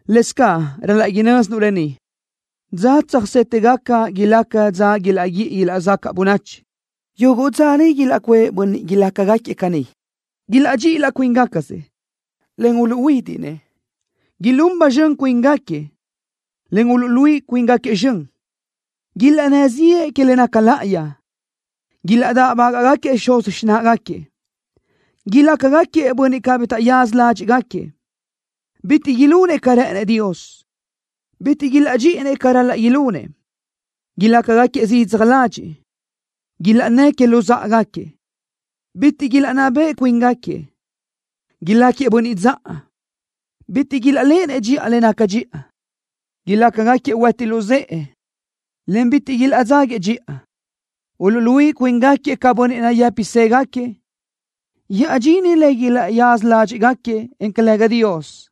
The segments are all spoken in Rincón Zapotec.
Lëscaʼ ral-laʼ inö́zinuʼ lë ni: Dza tsöjsétëgaca ilaca dza ilaʼguíʼi ilaʼzacaʼ bönachi. Yuguʼ dza niʼ ilaʼcuʼë bönniʼ ilácagaquiëʼ caní: Ilaʼdxíʼi laʼ cuíngacasëʼ, en uluʼhuídiʼnëʼ. Ilún ba zxön cuíngaquiëʼ, en uluʼluíʼi cuíngaquiëʼ zxön. Ilaʼnnë́ ziʼë que le naca láʼayi. Ilaʼdáʼbaguëʼë xuz xináʼagaquiëʼ. Ilácagaquiëʼ bönniʼ cabí taʼyaza ládxiʼgaquiëʼ. Bitiʼ ilunëʼ ca rë́ʼënëʼ Dios. Bitiʼ ilaʼdxíʼinëʼ ca ral-laʼ ilunëʼ. Ilácagaquiëʼ zidzaj ladxiʼ. Ilaʼnnë́ʼ que luzáʼagaquiëʼ. Bitiʼ ilaʼnná beʼe cuíngaquiëʼ. Ilácagaquiëʼ bönniʼ dzaʼa. Bitiʼ ilaʼléʼenëʼ dxiʼa le naca dxiʼa. Ilácagaquiëʼ hueti luzë́ʼe, en bitiʼ ilaʼdzáguiëʼ dxiʼa. Uluʼluíʼi cuíngaquiëʼ ca bönniʼ nayë́pisëgaquiëʼ. llaʼdxíʼinëʼ le ilaʼyázasö ládxiʼgaquiëʼ, en calëga Dios.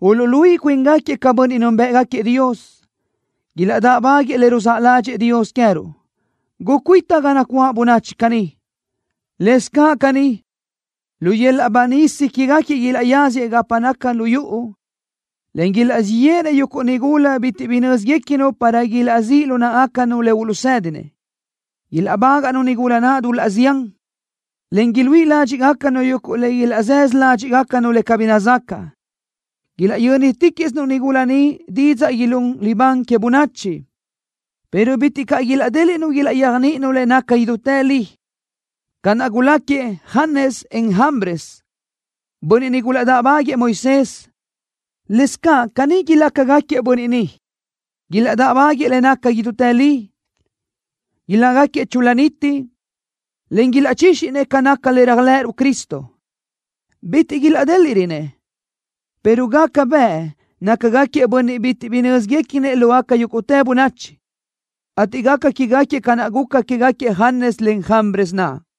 Uluʼluíʼi cuíngaquiëʼ ca bönniʼ núnbëʼgaquiëʼ Dios. Ilaʼdáʼbaguëʼë le ruzáʼ ládxëʼë Dios queë́ruʼ. Gucuíta ga nacuáʼ bönachi caní. Lëscaʼ caní, lu yöl-laʼ banísa quégaquiëʼ ilaʼyazëʼ gapa naca lu yuʼu, en ilaʼzíʼ yéʼenëʼ yuguʼ nigula bitiʼ bi nö́zguequinu para ilaʼzíʼ lu náʼagacanu le uluʼsédinëʼ. Ilaʼbágaʼnu nigula naʼ dul-laʼ zián, en iluíʼi ládxiʼgacanu yuguʼ le ilaʼzësö ládxiʼgacanu le cabí nazacaʼ. Ilaʼyö́niticaʼsinu nigula ni didzaʼ ilún libán que bönachi, pero bitiʼ caʼ ilaʼdéliʼnu ilaʼyéajniʼininu le naca idútë li. Ca naʼ guláquiëʼ Janes, en Jambres, bönniʼ niʼ gulaʼdáʼbaguëʼë Moisés, lëscaʼ caní ilácagaquiëʼ bönniʼ ni, ilaʼdáʼbaguëʼë le naca idútë li. Ilácagaquiëʼ chul-la niti, en ilaʼchíxinëʼ ca naca le réajlëʼëruʼ Cristo. Bitiʼ ilaʼdéliʼrönëʼ, pero gaca bëʼ nácagaquiëʼ bönniʼ bitiʼ bi nö́zguequinëʼ lógaca yúguʼtë bönachi, ateʼ gaca quégaquiëʼ ca naʼ guca quégaquiëʼ Janes, en Jambres naʼ.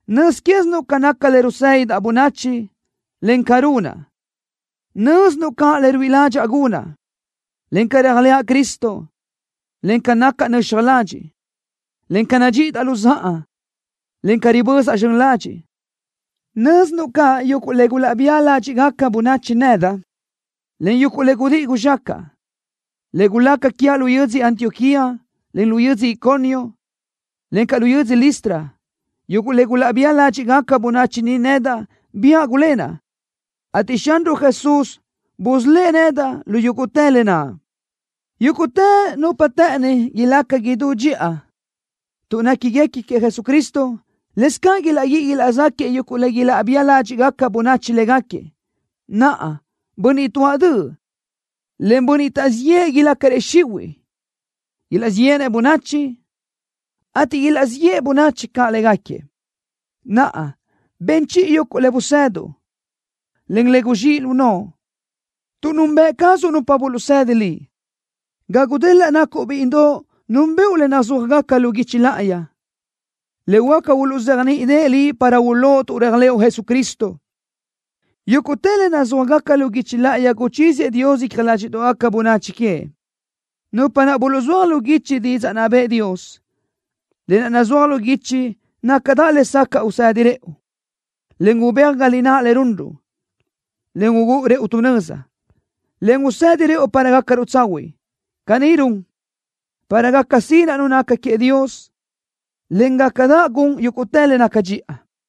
Nöz quézinuʼ ca naca le rusédidaʼ bönachi, en ca runaʼ. Nö́zinuʼ caʼ le ruíʼi ládxaʼa gunaʼ, en ca réajlëʼa Cristo, en ca nacaʼ nöxaj ladxiʼ, en ca nadxíʼidaʼ luzáʼa, en ca ribözaʼ zxön ladxiʼ. Nö́zinuʼ caʼ yuguʼ le gulaʼbía ládxiʼgaca bönachi nedaʼ, en yuguʼ le gudíʼi guzxácaʼa, le gulaca quiaʼ lu yödzö Antioquía, en lu yödzö Iconio, encaʼ lu yödzö Listra. Yuguʼ le gulaʼbía ládxiʼgaca bönachi niʼ nedaʼ biáʼ gulénaʼ, ateʼ Xanruʼ Jesús busölë́ʼ nedaʼ lu yúguʼtë lë naʼ. Yúguʼtë nupa të́ʼëni ilaca idú dxiʼa tuʼ néquiguequi queëʼ Jesucristo, lëscaʼ ilaʼguíʼi ilaʼzáquiëʼ yuguʼ le ilaʼbía ládxiʼgaca bönachi légaquiëʼ. Naʼa, bönniʼ tuáʼ döʼ, en bönniʼ taʼzíʼ yëʼë ilácarëʼ xihuiʼ. Ilaʼzíʼ yéʼenëʼ bönachi, ateʼ ilaʼzíʼ yeʼe bönachi caʼ légaquiëʼ. Naʼa, ben chiʼi yuguʼ le buzëduʼ, en le guzxíʼ lu noʼo, tuʼ nunbëʼ cazuʼ nupa buluʼsedi liʼ. Ga gudelaʼ nacuʼ bíʼidoʼ núnbëʼu le nazúajgaca lu guichi láʼayi, le huáca uluʼzéajniʼideʼe liʼ para ulóʼ tuʼ réajlëʼu Jesucristo. Yúguʼtë le nazúajgaca lu guichi láʼayi guchíziëʼ Dios icja ládxiʼdoʼgaca bönachi queëʼ, nupa naʼ buluʼzúaj lu guichi didzaʼ naʼ bëʼë Dios. Lë naʼ nazúaj lu guichi nácadaʼ lesacaʼ usedi rëʼu, en ubéaj ga lináʼ le runruʼ, en ugúʼu rëʼu tu nöza, en usedi rëʼu para gácaruʼ tsahuiʼ. Caní run, para gaca sinaʼ nu naca queëʼ Dios, en gácadaʼ gun yúguʼtë le naca dxiʼa.